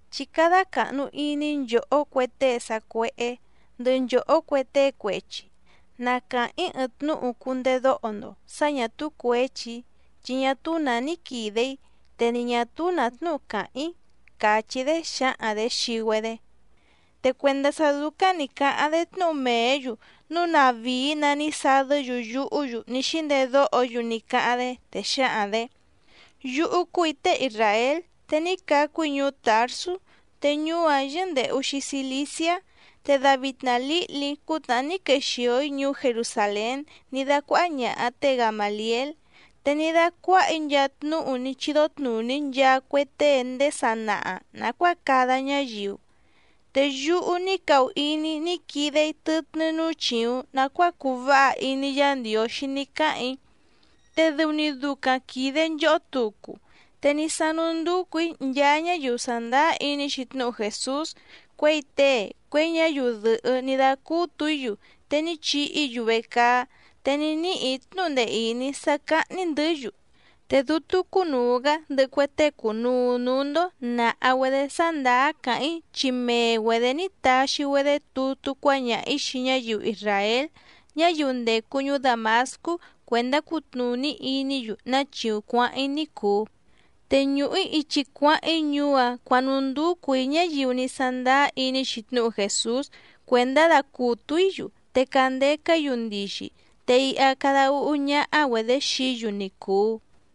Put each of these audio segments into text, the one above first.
—Chí cádá càhnu iní nchòhó cue tée sa cuéhé ndɨhɨ nchòhó cue tée cuechi, na càháⁿ‑í ɨɨⁿ tnúhu cundedóho‑ndo sǎ ñà túú cuěchi‑í, chi ñá túú nǎ ní quìde‑í, te ni ñà túú nǎ tnúhu càháⁿ‑í —càchí‑dé xǎhaⁿ‑dě xii‑güedé. Te cuèndá sá dúcáⁿ nǐ cáháⁿ‑dé tnúhu mèé‑yu núu tnàvíí‑nǎ ní sadɨ́‑yu yuhú‑yu ní xíndedóho‑yu ní cáháⁿ‑dé, te xǎhaⁿ‑dě: —Yúhú cúù‑í tée isràél, te ní cacu‑í ñuú Tàrsú, te ñuú‑áⁿ yɨ́ndèhu‑xi Ciliciá. Te davitna lǐhli‑í cútnàhá ní quexìo‑í ñuú Jerusàlén ní dácuáhá ñàha té Gamàliél. Te ní dácuáhà‑í nchaa tnúhu ní chídó tnùní nchaa cue tée ndéé sanaha nàcuáa cada ñáyiu. Te yúhú ní cahu iní‑í ní quide‑í tɨtnɨ́ núú chìuⁿ nacuáa cuu váha iní Yǎ Ndiǒxí ní cáhàⁿ‑í, te dɨu‑ni ducaⁿ quìde nchohó tucu. Te ní sánú ndúcù‑í nchaa ñáyiu sàndáá iní‑xi tnúhu Jèsús, cuěi tée, cuěi ñáyiu dɨ̀hɨ́ ní dácútù‑í‑yu, te ní chihi‑í‑yu vecaá, te ní níhì‑í tnúhu ndee ìní sá cáhní‑ndɨ̌‑yu. Te dútú cúnùu‑gá ndɨhɨ cue tée cùnuu núú‑ndó nàha‑güedé sá ndàá càháⁿ‑í chi mee‑güedě ní taxi‑güedé tutú cuáñaha‑ǐ xii ñáyiu isràél ñáyiu ndècu ñuú Dàmascú cuèndá cutnùní iní‑yu ná chíúⁿ cuǎháⁿ‑í ní cùu. Te ñùhu‑í ichi cuáháⁿ‑í ñuú‑áⁿ cuǎnúndúcù‑í ñáyiu ní sándáá iní‑xi tnúhu Jèsús cuèndá dacùtu‑í‑yu te candeca‑í‑yu ndixi, te iha cada úhú ñáhá‑güedě xií‑yu ni cùu.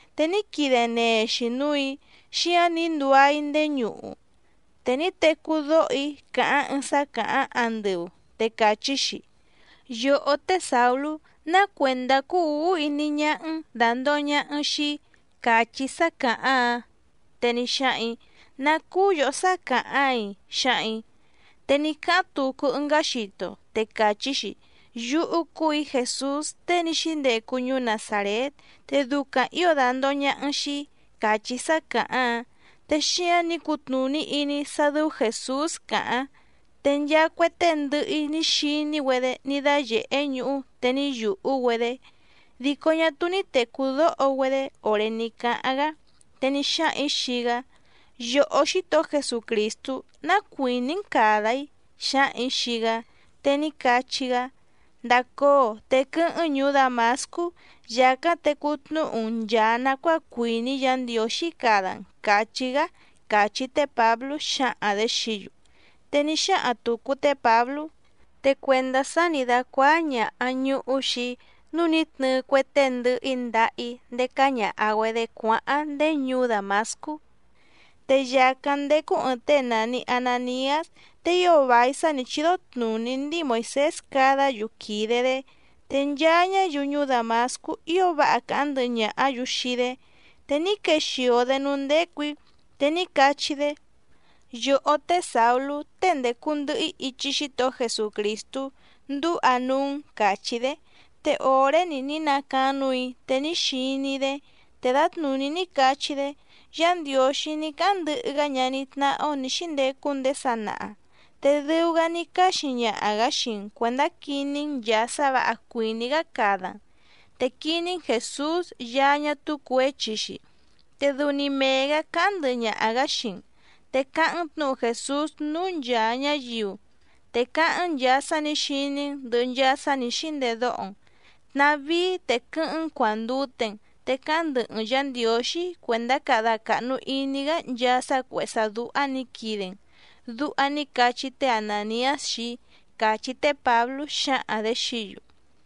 Te ní quide nee‑xi núù‑í, xíǎⁿ ní nduá‑í ndéé ñuhu. Te ní tecú dóho‑í càháⁿ ɨɨⁿ sá càháⁿ andɨu, te càchí‑xi: “Yòhó té Sàulú, ¿ná cuèndá cúú ǔhú iní ñáhá‑n dàndoho ñaha‑n xii‑í?”, càchí sá càháⁿ‑áⁿ. Te ní xáhaⁿ‑ǐ: “¿Ná cúú yòhó sá càháⁿ‑áiⁿ?”, xǎhaⁿ‑ǐ. Te ní cáháⁿ tucu ɨngá xito te càchí‑xi: “Yúhú cúù‑í Jèsús tée ní xíndecu ñuú Nazàrét, te ducaⁿ ǐo dàndoho ñaha‑n xii‑í”, càchí sá càháⁿ‑áⁿ. Te xíǎⁿ ní cutnùní iní‑í sá dɨ́ú Jèsús càháⁿ. Te nchaa cue tée ndɨhɨ‑í ní xiní‑güedé ní dáyèhé ñuhú, te ní yùhú‑güedé, dico ñá túú ní tècú dóho‑güedé òré ní cáháⁿ‑gá. Te ní xáhaⁿ‑ǐ xii‑gá: “Yòhó Xítohó Jesucrìstú, ¿ná cuìní‑n càda‑í?”, xǎhaⁿ‑ǐ xii‑gá. Te ní cachí‑gá: “Ndacóo, te quɨ́hɨ́ⁿ‑n ñùú Dàmascú, yàcáⁿ tecú tnúhu‑n nchàa nacuáa cuìní Yǎ Ndiǒxí cada‑n”, càchí‑gá —càchí té Pǎblú xǎhaⁿ‑dě xií‑yu. Te ní xáhaⁿ tùcu té Pǎblú: —Te cuèndá sá nǐ dácuáá ñàha ñuhú xii‑í nǔu ní tnɨɨ cue tée ndɨhɨ‑í ndaha‑í ndécá ñàha‑güedé cuáháⁿ ndéé ñuú Dàmascú. ’Te yàcáⁿ ndécú ɨ̀ɨⁿ tée nàni Ananiás, te ío vài sá nǐ chídó tnùní ndíi Moìsés cadá‑yu quìde‑dé. Te nchaa ñáyiu ñuú Dàmascú ío váha càháⁿ ndɨhɨ ñàhá‑yu xii‑dé. Te ní quexìo‑dé núú ndécù‑í, te ní cachí‑dé: “Yòhó té Sàulú, tée ndècu ndɨhɨ‑í ichi Xítohó Jesucrìstú, ndúha núú‑n”, càchí‑dé. Te òré‑ni ní nacaáⁿ núù‑í te ní xiní‑í‑dé. Te dǎtnùní ní cachí‑dé: “Yá Ndiǒxí ní cáháⁿ ndɨhɨ‑gá ñaní tnáhá‑ó nǐ xíndecu ndéé sanaha. Te dɨu‑gá ní cáxi ñaha‑gǎ xii‑n cuèndá quiní‑n nchàa sá vǎha cuìní‑gá cada‑n. Te quiní‑n Jèsús Yaá ñá túú cuěchi‑xi, te dɨu‑ni mee‑gǎ cáháⁿ ndɨhɨ ñaha‑gǎ xii‑n. Te cáháⁿ‑n tnǔhu Jèsús núú nchàa ñáyiu, te cáháⁿ‑n nchàa sá nǐ xiní‑n ndɨ̀hɨ nchaa sá nǐ xíndedóho‑n. Tnàvíí, te quɨ́hɨ́ⁿ‑n cuàndute‑n, te cáháⁿ ndɨhɨ‑n Yǎ Ndiǒxí cuèndá cada càhnu iní‑gá nchaa sá cuèhé sá dúhá nǐ quide‑n”, duha ní cachí té Anàniás xii‑í —càchí té Pǎblú xǎhaⁿ‑dě xií‑yu.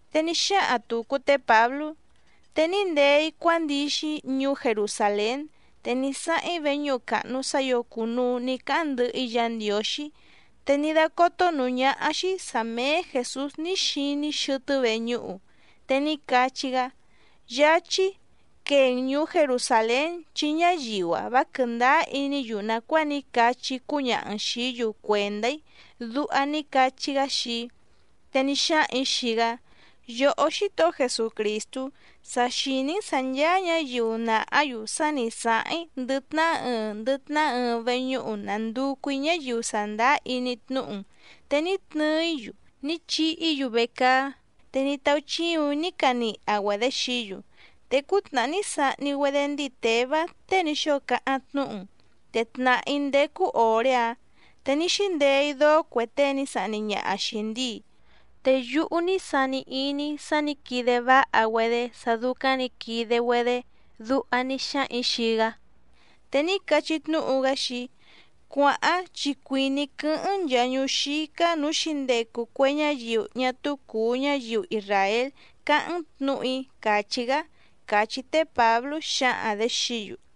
Te ní xáhaⁿ tùcu té Pǎblú: —Te ní ndee‑í cuándixi‑í ñuú Jerusàlén. Te ní sáháⁿ‑í veñúhu càhnu sá ǐo cùnuu ní cáháⁿ ndɨhɨ‑í Yǎ Ndiǒxí, te ní dácótó nǔú ñáhá‑xí sǎ méé Jèsús ní xiní‑í xɨtɨ́ veñúhu, te ní cachí‑gá: “Yáchí, quee‑n ñùú Jerusàlén, chi ñáyiu‑a vá quɨ̀ndáá iní‑yu nàcuáa ní cachí‑í cúñaha‑n xìí‑yu cuèndá‑í”, duha ní cachí‑gá xii‑í. Te ní xáhaⁿ‑ǐ xii‑gá: “Yòhó Xítohó Jesucrìstú, sa xìní‑n sǎ ncháá ñǎyiu nàhá‑yu sá nǐ sáháⁿ‑í ndɨ tnahá ɨɨⁿ ndɨ tnahá ɨɨⁿ veñúhu nànducu‑í ñáyiu sàndáá iní tnúhu‑n, te ní tnɨɨ‑í‑yu, ní chihi‑í‑yu vecaá, te ní táúchíùⁿ‑í ní caniha‑güedě xií‑yu. Te cútnàhá ní sahni‑güedé ndíi Těvá tée ní xóo cáháⁿ tnúhu‑n, te tnàhá‑í ndécú òré‑áⁿ te ní xíndeé‑í dóó cue tée ní sahni ñaha xìi ndíi. Te yúhú ní cáhàⁿ‑í sá nǐ quide váha‑güedé sá dúcáⁿ nǐ quide‑güedé”, duha ní xáhaⁿ‑ǐ xii‑gá. Te ní cachí tnúhu‑gá xii‑í: “Cuàháⁿ chi cuìní‑í quɨ́hɨ́ⁿ‑n nchàa ñuú xícá nǔú xǐndecu cue ñáyiu ñá túú cùu ñáyiu isràél cáháⁿ‑n tnǔhu‑í”, càchí‑gá —càchí té Pǎblú xǎhaⁿ‑dě xií‑yu.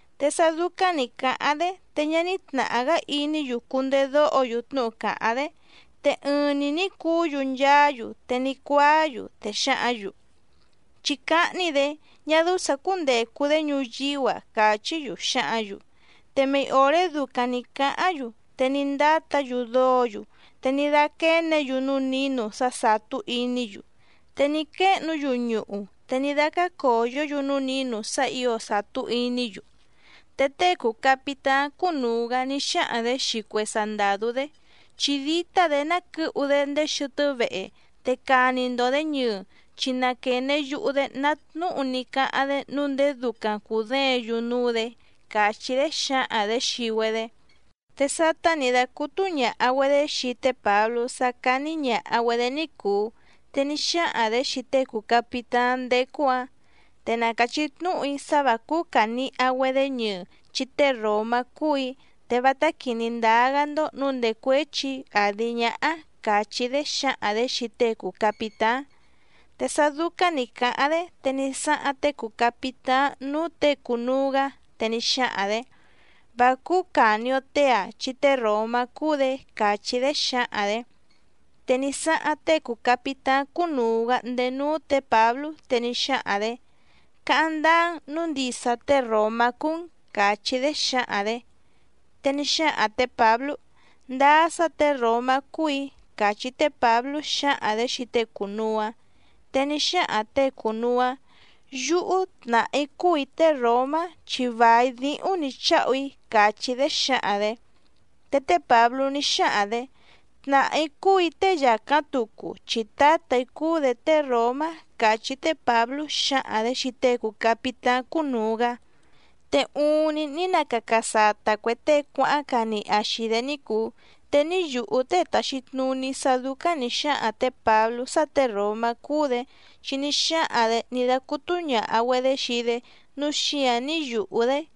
Te sá dúcáⁿ nǐ cáháⁿ‑dé, te ñá ní tnàhá‑gá iní‑yu cundedóho‑yu tnúhu càháⁿ‑dé. Te ɨɨⁿ‑ni nǐ cuú‑yu nchaá‑yu, te ní cuáá‑yu, te xǎhǎⁿ‑yu: —¡Chí cáhní‑dě! ¡Ñá dɨ́ú sǎ cúndècu‑dé ñuyíú‑a! —càchí‑yu xǎhǎⁿ‑yu. Te mei òré ducaⁿ nǐ cáháⁿ‑yu, te ní ndátǎ‑yu dóǒ‑yu, te ní dáquéně‑yu núú nǐnu sá sàtú iní‑yu. Te ní quéhnu‑yu ñuhu, te ní dácácòyó‑yu núú nǐnu sá ǐo sàtú iní‑yu. Te tée cùu capitáⁿ cúnùu‑gá ní xáhaⁿ‑dě xii cue sandàdú‑dé: —Chí dítá‑dě ná quɨ̌hu‑dé ndéé xɨtɨ́ vehe, te cani‑ndo‑dě ñɨɨ, chi na quène yuhu‑dé ná tnúhu ní cáháⁿ‑dé nǔu ndéé dúcáⁿ cùdéěⁿ‑yu núú‑dě —càchí‑dé xǎhaⁿ‑dě xii‑güedé. Te sátá nǐ dácútú ñàha‑güedé xii té Pǎblú sá cání ñàha‑güedé ní cùu, te ní xáhaⁿ‑dě xii tée cùu capitáⁿ ndécú‑ǎⁿ: —Te na càchí tnúhu‑í sá vǎ cúú càniha‑güedé ñɨɨ, chi tée ròmá cúù‑í, te vátá quìní ndáá‑gá‑ndó nǔu ndècuéchi‑í àdi ñáhá —càchí‑dé xǎhaⁿ‑dě xii tée cùu capitáⁿ. Te sá dúcáⁿ nǐ cáháⁿ‑dé, te ní sáháⁿ tée cùu capitáⁿ núú těe cùnuu‑gá, te ní xáhaⁿ‑dě: —Vá cúú càni‑o tée‑ǎⁿ, chi tée ròmá cúú‑dě —càchí‑dé xǎhaⁿ‑dě. Te ní sáháⁿ tée cùu capitáⁿ cúnùu‑gá ndéé núú tě Pǎblú, te ní xáhaⁿ‑dě: —Cáháⁿ ndáá‑n nǔu ndisa tée ròmá cúú‑n —càchí‑dé xǎhaⁿ‑dě. Te ní xáhaⁿ tě Pǎblú: —Ndáá sá těe ròmá cúù‑í —càchí té Pǎblú xǎhaⁿ‑dě xii tée cùnuu‑áⁿ. Te ní xáhaⁿ těe cùnuu‑áⁿ: —Yúhú tnàhá‑í cúù‑í tée ròmá, chi vài díhúⁿ nǐ cháhu‑í —càchí‑dé xǎhaⁿ‑dě. Te té Pǎblú ní xáhaⁿ‑dě: —Tnàhá‑í cúù‑í tée yàcáⁿ tucu, chi tǎtà‑í cúú‑dě tée ròmá —càchí té Pǎblú xǎhaⁿ‑dě xii tée cùu capitáⁿ cúnùu‑gá. Te uuⁿni ní nacaca sata cuè tée cuáháⁿ caniha xìi‑dé ní cùu. Te ní yùhú tée tàxi tnuní sá dúcáⁿ nǐ xáhaⁿ tě Pǎblú sá těe ròmá cúú‑dě, chi ní xáhaⁿ‑dě ní dácútú ñàha‑güedé xii‑dé, núu xíǎⁿ ní yùhu‑dé.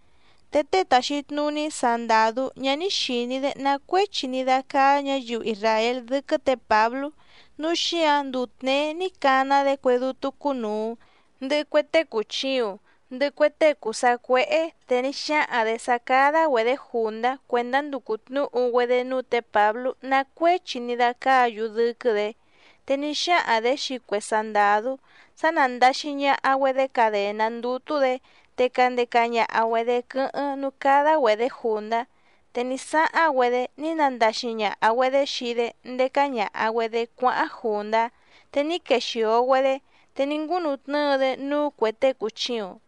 Te tée tàxi tnuní sandàdú ñá ní xìní‑dé ná cuéchi ní dácáá ñǎyiu isràél dɨ́quɨ́ tě Pǎblú, núu xíǎⁿ nduu tněé ní cana‑dé cue dútú cúnùu, ndɨhɨ cue tée cùchiuⁿ, ndɨhɨ cue tée cùu sacuéhé, te ní xáhaⁿ‑dě sá cádá‑güedě jùndá cuèndá nducu tnǔhu‑güedé núú tě Pǎblú ná cuéchi ní dácáǎ‑yu dɨ́quɨ́‑dě. Te ní xáhaⁿ‑dě xii cue sandàdú sá nándàxi ñaha‑güedé cadèná ndútú‑dě, te candeca ñaha‑güedě quɨ́hɨ́ⁿ núú cádá‑güedě jùndá. Te ní sáháⁿ‑güedé ní nandaxi ñàha‑güedé xii‑dé ndécá ñàha‑güedé cuáháⁿ jùndá, te ní quexìo‑güedé, te ní ngúnutnɨ́ɨ‑dé núú cuè tée cùchiuⁿ.